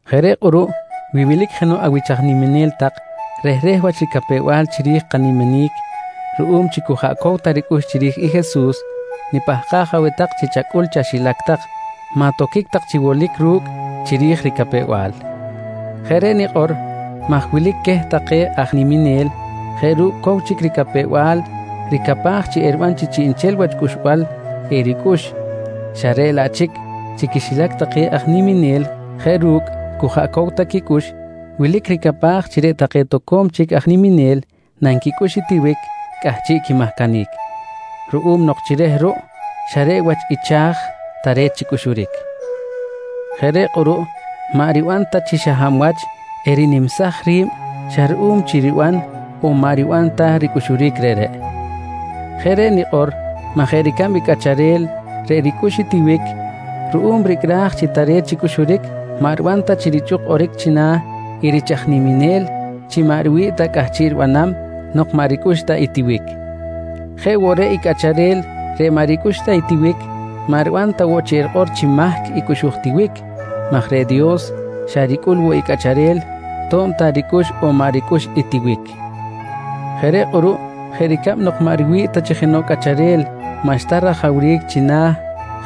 Jeꞌ reꞌ kꞌuruꞌ, wi wilic jenoꞌ awich aj niminel tak rehreh wach ricapew-bal chiri̱j i kaniminic ruꞌum chi cu jaꞌ cow ta ricꞌux chiri̱j i Jesus, nipahkaj aweh tak chi chacꞌul chaxilac tak, maꞌ toquic tak chi wolic ru̱cꞌ chiri̱j i ricapew-bal. Jeꞌ reꞌ nikꞌor maj wilic queh take aj niminel jeꞌ ru̱cꞌ cow chic ricapew-bal ricapaj chi eriban chi chiꞌnchel wach cꞌuxbal ericꞌux xa reꞌ laꞌ chic chi quixilac take aj niminel jeꞌ ru̱cꞌ cu jaꞌ cow ta quicꞌux, wilic ricapaj chi reꞌ take toco̱m chic aj niminel nanquicꞌux i tiwic cꞌahchiꞌ quimahcanic, ruꞌum nok chi reh ruꞌ xa reꞌ wach i cha̱j tare̱t chi cꞌuxuric. Jeꞌ reꞌ kꞌuruꞌ maꞌ riban ta chi xa hab wach erinimsaj ri̱b xa ruꞌum chi riban on maꞌ riban ta ricꞌuxuric reꞌreꞌ. Jeꞌ reꞌ nikꞌor maj jeꞌ ricab i cꞌacharel reꞌ ricꞌux i tiwic ruꞌum ricꞌraj chi tare̱t chi cꞌuxuric, maꞌ riban ta chi richꞌuk kꞌoric china̱ i rich aj niminel chi maꞌ riwi̱ꞌ ta cꞌahchiꞌ ribanam nok maꞌ ricꞌux ta i tiwic. Jeꞌ woꞌ reꞌ i cꞌacharel reꞌ maꞌ ricꞌux ta tiwic maꞌ riban ta woꞌ chi rikꞌor chi mahc i cꞌuxuj tiwic maj reꞌ Dios xa ricꞌul woꞌ i cꞌacharel to̱b ta ricꞌux on maꞌ ricꞌux i tiwic. Jeꞌ reꞌ kꞌuruꞌ jeꞌ ricab nok maꞌ riwi̱ꞌ ta chi jenoꞌ cꞌacharel maꞌxta rajawric china̱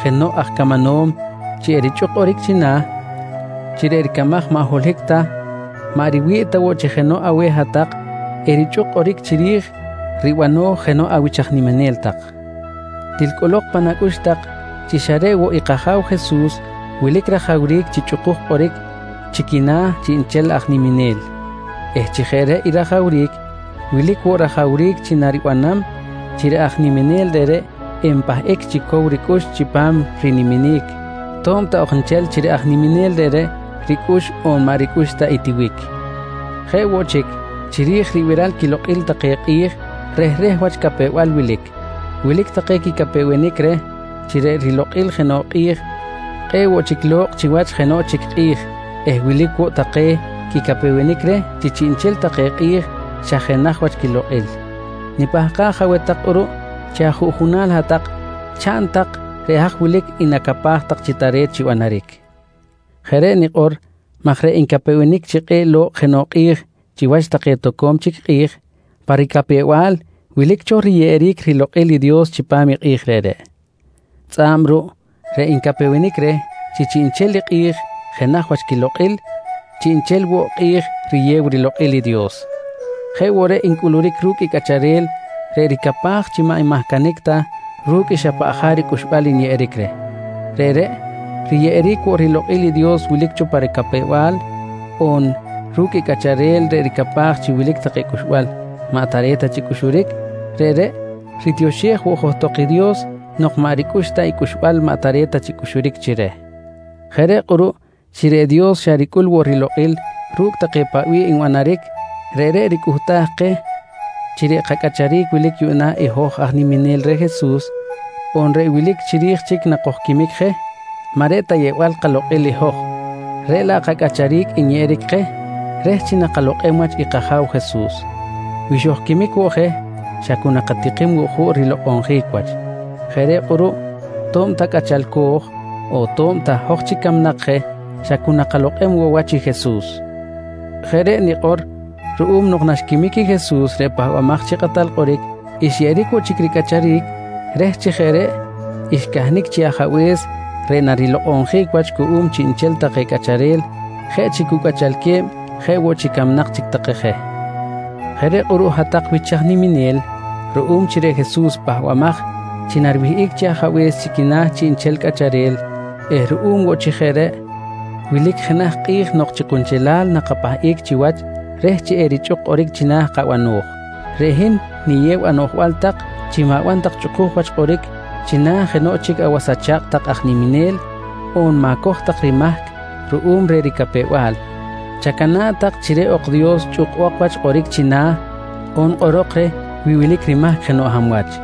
jenoꞌ aj camanom chi erichꞌuk kꞌoric china̱ chi reꞌ ricamaj maꞌ holohic ta, maꞌ riwi̱ꞌ ta woꞌ chi jenoꞌ aweh hat-tak erichꞌuk kꞌoric chiri̱j ribano̱j jenoꞌ awich aj niminel tak. Til cꞌolok pan acꞌux tak chi xa reꞌ woꞌ i kAja̱w Jesus wilic rajawric chi chꞌukuj kꞌoric chi quina̱ chiꞌnchel aj niminel eh chi jeꞌ reꞌ i rajawric, wilic woꞌ rajawric chi naribanam chi reꞌ aj niminel reꞌreꞌ enpahꞌic chi cow ricꞌux chipam riniminic to̱b ta ok nchel chi reꞌ aj niminel reꞌreꞌ ricꞌux on maꞌ ricꞌux ta i tiwic. Jeꞌ woꞌ chic, chiri̱j ribiral quilokꞌil take kꞌi̱j rehreh wach capew-bal wilic. Wilic take quicapewenic reh chi reꞌ rilokꞌil jenoꞌ kꞌi̱j kꞌe̱ꞌ woꞌ chic lo̱kꞌ chiwach jenoꞌ chic kꞌi̱j eh wilic woꞌ take quicapewenic reh chi chiꞌnchel take kꞌi̱j xa jenaj wach quilokꞌil. Nipahkaj aweh tak kꞌuruꞌ chi ajuꞌjunal hat-tak chaꞌn tak reꞌ haj wilic i nacapaj tak chi tare̱t chi banaric. Jeꞌ reꞌ nikꞌor maj reꞌ ncapewenic chi kꞌe̱ꞌ lo̱kꞌ jenoꞌ kꞌi̱j chiwach take toco̱m chic kꞌi̱j, pa ricapew-bal wilic cho riyeꞌeric rilokꞌil i Dios chipam i kꞌi̱j reꞌreꞌ. Tzꞌa̱b ruꞌ reꞌ ncapewenic reh chi chiꞌnchel i kꞌi̱j jenaj wach quilokꞌil, chiꞌnchel woꞌ kꞌi̱j riyew rilokꞌil i Dios. Jeꞌ woꞌ reꞌ ncꞌuluric ru̱cꞌ i cꞌacharel reꞌ ricapaj chi maꞌ nmahcanic ta ru̱cꞌ i xa paꞌ jaric cꞌuxbal nyeꞌeric reh, reꞌreꞌ riyeꞌeric woꞌ rilokꞌil i Dios wilic cho pa ricapew-bal on ru̱cꞌ i cꞌacharel reꞌ ricapaj chi wilic take cꞌuxbal maꞌ tare̱t ta chi cꞌuxuric, reꞌreꞌ ritioxej woꞌ johtok i Dios nok maꞌ ricꞌux ta i cꞌuxbal maꞌ tare̱t ta chi cꞌuxuric chi reh. Jeꞌ reꞌ kꞌuruꞌ chi reꞌ Dios xa ricꞌul woꞌ rilokꞌil ru̱cꞌ take paꞌ wilic nbanaric, reꞌreꞌ ricꞌuhtaj keh chi reꞌ kacꞌacharic wilic yuꞌna i hoj aj niminel reh Jesus, on reꞌ wilic chiri̱j chic nakojquimic je, maꞌ reꞌ ta yeꞌbal kalokꞌil i hoj reꞌ laꞌ kacꞌacharic nyeꞌeric keh reh chi nakalokꞌem wach i kAja̱w Jesus. Wi xojquimic woꞌ je, xa cu nakatikim woꞌ juꞌ rilokꞌonjic wach. Jeꞌ reꞌ kꞌuruꞌ to̱b ta cꞌachalco̱j on to̱b ta hoj chic camnak je, xa cu nakalokꞌem woꞌ wach i Jesus. Jeꞌ reꞌ nikꞌor ruꞌum nok naxquimic i Jesus reꞌ Pahbamaj chi Kꞌatal Kꞌoric, xyeꞌeric woꞌ chic ricꞌacharic reh chi jeꞌ reꞌ xcahnic chi Ajabe̱s reꞌ narilokꞌonjic wach cuꞌum chiꞌnchel take cꞌacharel jeꞌ chi cu cꞌachalque̱b jeꞌ woꞌ chi camnak chic take je. Jeꞌ reꞌ kꞌuruꞌ hat-tak wich aj niminel, ruꞌum chi reꞌ Jesus pahbamaj chi nariwihꞌic chi Ajabe̱s chi quina̱ chiꞌnchel cꞌacharel eh ruꞌum woꞌ chi jeꞌ reꞌ, wilic jenaj i kꞌi̱j nok chi kunchelal nakapahꞌic chiwach reh chi erichꞌuk kꞌoric china̱ i kabano̱j, reꞌ hin niyew anoꞌjbal tak chi ma̱ban tak chꞌukuj wach kꞌoric china̱ jenoꞌ chic awas acha̱kꞌ tak aj niminel on ma̱coj tak rimahc ruꞌum reh ricapew-bal, chacana̱ꞌ tak chi reꞌ ok Dios chꞌukbok wach kꞌoric china̱ on kꞌorok reh wi wilic rimahc jenoꞌ hab wach.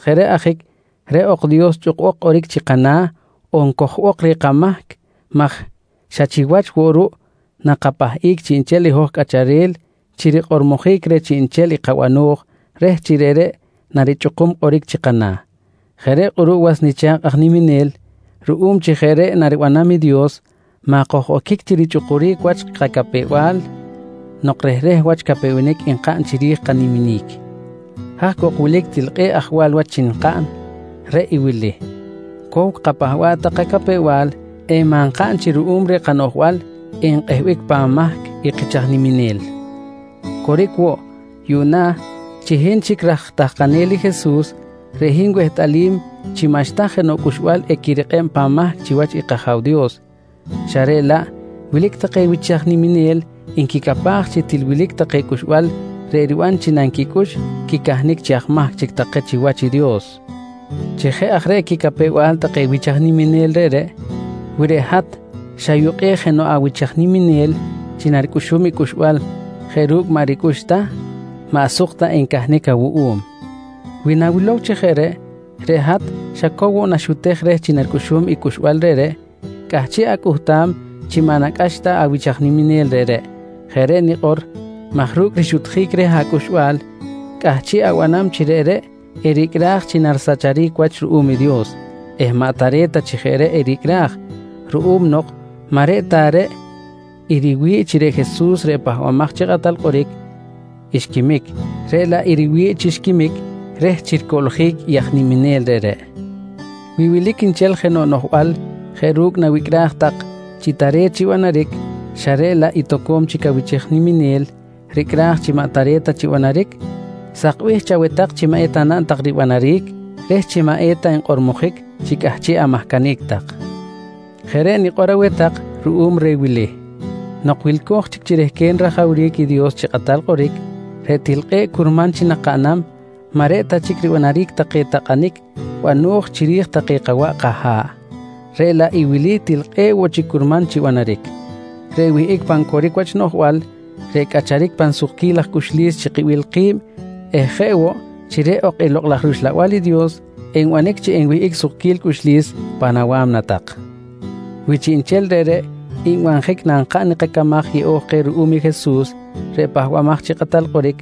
Jeꞌ reꞌ ajic reꞌ ok Dios chꞌukbok kꞌoric chi kana̱ on cojbok reh kamahc maj xa chiwach woꞌ ruꞌ nakapahꞌic chiꞌnchel i hoj cꞌacharel chi rikꞌormojic reh chiꞌnchel i kabano̱j reh chi reꞌreꞌ narichꞌukum kꞌoric chi kana̱. Jeꞌ reꞌ kꞌuruꞌ was nicha̱kꞌ aj niminel, ruꞌum chi jeꞌ reꞌ naribanam i Dios maꞌ koj-oquic chi richꞌukuric wach kacapew-bal nok rehreh wach capewenic nkaꞌn chiri̱j i kaniminic. Haj cok wilic til kꞌe̱ꞌ ajwal wach chi kaꞌn, reꞌ i wili: Cow kapahba̱ꞌ tak kacapew-bal eh maꞌ nkaꞌn chi ruꞌum reh kanoꞌjbal enkꞌehbic pan mahc i kich aj niminel. Coric woꞌ, yuꞌna chi hin chic raj tahkanel i Jesus reꞌ hin wehtꞌalim chi maꞌxta jenoꞌ cꞌuxbal equirikꞌeb pan mahc chiwach i kAja̱w Dios, xa reꞌ laꞌ wilic take wich aj niminel nquicapaj chi til wilic take cꞌuxbal reꞌ riban chi nanquicꞌux quicahnic chi aj mahc chic take chiwach i Dios. Chi jeꞌ aj reꞌ quicapew-bal take wich aj niminel reꞌreꞌ, wi reꞌ hat xayukꞌej jenoꞌ awich aj niminel chi naricꞌuxum i cꞌuxbal jeꞌ ru̱cꞌ maꞌ ricꞌux ta, maꞌ suk ta encahnic awuꞌum. Wi nawilow chi jeꞌ reꞌ, reꞌ hat xa cow woꞌ naxutej reh chi naricꞌuxum i cꞌuxbal reꞌreꞌ cꞌahchiꞌ acꞌuhtam chi maꞌ nacꞌax ta awich aj niminel reꞌreꞌ. Jeꞌ reꞌ nikꞌor maj ru̱cꞌ rixutjic reh acꞌuxbal, cꞌahchiꞌ abanam chi reꞌreꞌ ericꞌraj chi narisacharic wach ruꞌum i Dios eh maꞌ tare̱t ta chi jeꞌ reꞌ ericꞌraj, ruꞌum nok maꞌ reꞌ ta reꞌ i riwi̱ꞌ chi reꞌ Jesus reꞌ Pahbamaj chi Kꞌatal Kꞌoric xquimic, reꞌ laꞌ i riwi̱ꞌ chi xquimic reh chi ricoꞌljic i aj niminel reꞌreꞌ. Wi wilic nchel jenoꞌ noꞌjbal jeꞌ ru̱cꞌ nawicꞌraj tak chi tare̱t chi ribanaric xa reꞌ laꞌ i toco̱m chic awich aj niminel ricꞌraj chi maꞌ tare̱t ta chi banaric, sakbih chaweh tak chi maꞌ eta naꞌn tak ribanaric reh chi maꞌ eta nkꞌormojic chi cꞌahchiꞌ amahcanic tak. Jeꞌ reꞌ nikꞌor aweh tak ruꞌum reh wili: Nok wilco̱j chic chi rehquen rajawric i Dios chi kꞌatal kꞌoric, reꞌ til kꞌe̱ꞌ curman chi nakaꞌnam maꞌ reꞌ ta chic ribanaric take takꞌanic bano̱j chiri̱j take kawaꞌ kaha̱ꞌ, reꞌ laꞌ i wili til kꞌe̱ꞌ woꞌ chic curman chi banaric: Reꞌ wihꞌic pan coric wach noꞌjbal, reꞌ cꞌacharic pan sukquil laj cꞌuxlis chi kibil ki̱b eh jeꞌ woꞌ chi reꞌ ok i Lokꞌ laj rUxlabal i Dios enbanic chi enwihꞌic sukquil cꞌuxlis pan awa̱mna tak. Wi chiꞌnchel reꞌreꞌ nbanjic nankaꞌn i kacamaj yeꞌo̱j keh ruꞌum i Jesus reꞌ Pahbamaj chi Kꞌatal Kꞌoric,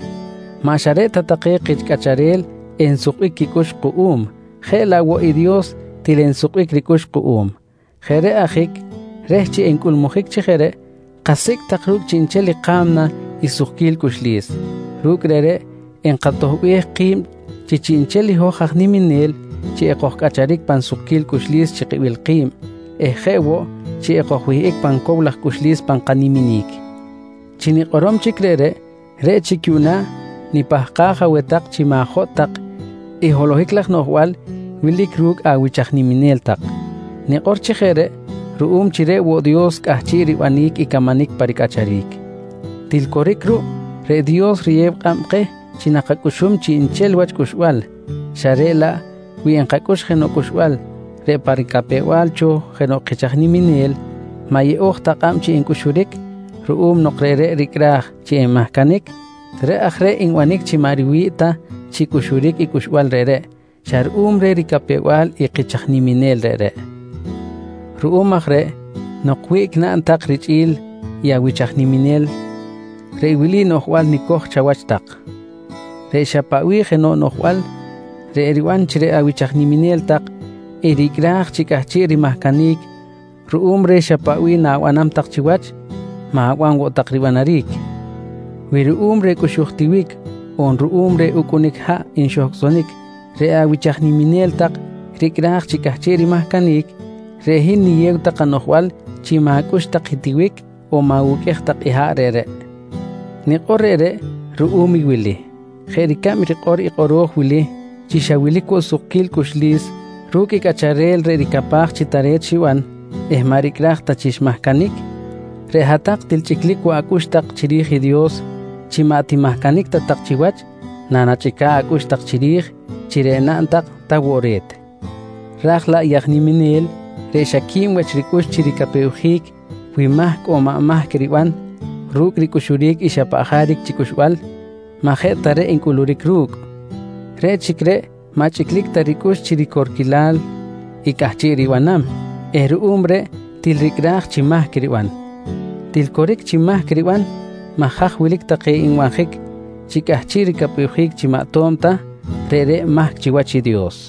maꞌ xa reꞌ ta take kich cꞌacharel ensukbic quicꞌux kuꞌum, jeꞌ laꞌ woꞌ i Dios til ensukbic ricꞌux kuꞌum. Jeꞌ reꞌ ajic reh chi encꞌulmujic chi jeꞌ reꞌ, kasicꞌ tak ru̱cꞌ chiꞌnchel i ka̱mna i sukquil cꞌuxlis. Ru̱cꞌ reꞌreꞌ enkatoꞌbej ki̱b chi chiꞌnchel i hoj aj niminel chi ekojcꞌacharic pan sukquil cꞌuxlis chi kibil ki̱b eh jeꞌ woꞌ chi ekojwihꞌic pan cow laj cꞌuxlis pan kaniminic. Chi nikꞌorom chic reꞌreꞌ, reꞌ chic yuꞌna nipahkaj aweh tak chi ma̱jotꞌ tak i holohic laj noꞌjbal wilic ru̱cꞌ awich aj niminel tak. Nikꞌor chi jeꞌ reꞌ ruꞌum chi reꞌ woꞌ Dios cꞌahchiꞌ ribanic i camanic pa ricꞌacharic. Til coric ruꞌ, reꞌ Dios riyeb kꞌab keh chi nakacꞌuxum chiꞌnchel wach cꞌuxbal xa reꞌ laꞌ wi nkacꞌux jenoꞌ cꞌuxbal reꞌ pa ricapew-bal cho jenoꞌ kich aj niminel maꞌ yeꞌo̱j ta kꞌab chi cꞌuxuric ruꞌum nok ru̱cꞌ reꞌreꞌ ricꞌraj chi enmahcanic, reꞌ aj reꞌ nbanic chi maꞌ riwi̱ꞌ ta chi cꞌuxuric i cꞌuxbal reꞌreꞌ xa ruꞌum reh ricapew-bal i kich aj niminel reꞌreꞌ. Ruꞌum aj reꞌ nok wiꞌc naꞌn tak richꞌi̱l i awich aj niminel, reꞌ wili noꞌjbal nicoj chawach tak: Reꞌ xa paꞌ bih jenoꞌ noꞌjbal reꞌ eriban chi reꞌ awich aj niminel tak ericꞌraj chi cꞌahchiꞌ rimahcanic ruꞌum reh xa paꞌ bih na̱banam tak chiwach, ma̱ban woꞌ tak ribanaric. Wi ruꞌum reh cꞌuxuj tiwic on ruꞌum reh ucꞌunic haꞌ nxohcꞌsonic reꞌ awich aj niminel tak ricꞌraj chi cꞌahchiꞌ rimahcanic, reꞌ hin niyew tak anoꞌjbal chi ma̱cꞌux tak i tiwic on ma̱wuqꞌuej tak i haꞌ reꞌreꞌ. Nikꞌor reꞌreꞌ ruꞌum i wili: Jeꞌ ricab rikꞌor i kꞌoro̱j wili chi xa wilic woꞌ sukquil cꞌuxlis ru̱cꞌ i cꞌacharel reꞌ ricapaj chi tare̱t xiban eh maꞌ ricꞌraj ta chi xmahcanic, reꞌ hat-tak til chꞌiclic woꞌ acꞌux tak chiri̱j i Dios chi maꞌ timahcanic ta tak chiwach nanachꞌica̱ꞌ acꞌux tak chiri̱j chi reꞌ naꞌn tak ta woꞌ re̱t. Ra̱j laꞌ i aj niminel reꞌ xa qui̱b wach ricꞌux chi ricapewjic wi mahc on maꞌ mahc riban ru̱cꞌ ricꞌuxuric i xa paꞌ jaric chi cꞌuxbal maꞌ jeꞌ ta reꞌ ncꞌuluric ru̱cꞌ. Reꞌ chic reꞌ maꞌ chꞌiclic ta ricꞌux chi ricorquilal i cꞌahchiꞌ ribanam eh ruꞌum reꞌ til ricꞌraj chi mahc riban. Til coric chi mahc riban maj haj wilic take nbanjic chi cꞌahchiꞌ ricapewjic chi maꞌ ato̱b ta, reꞌreꞌ mahc chiwach i Dios.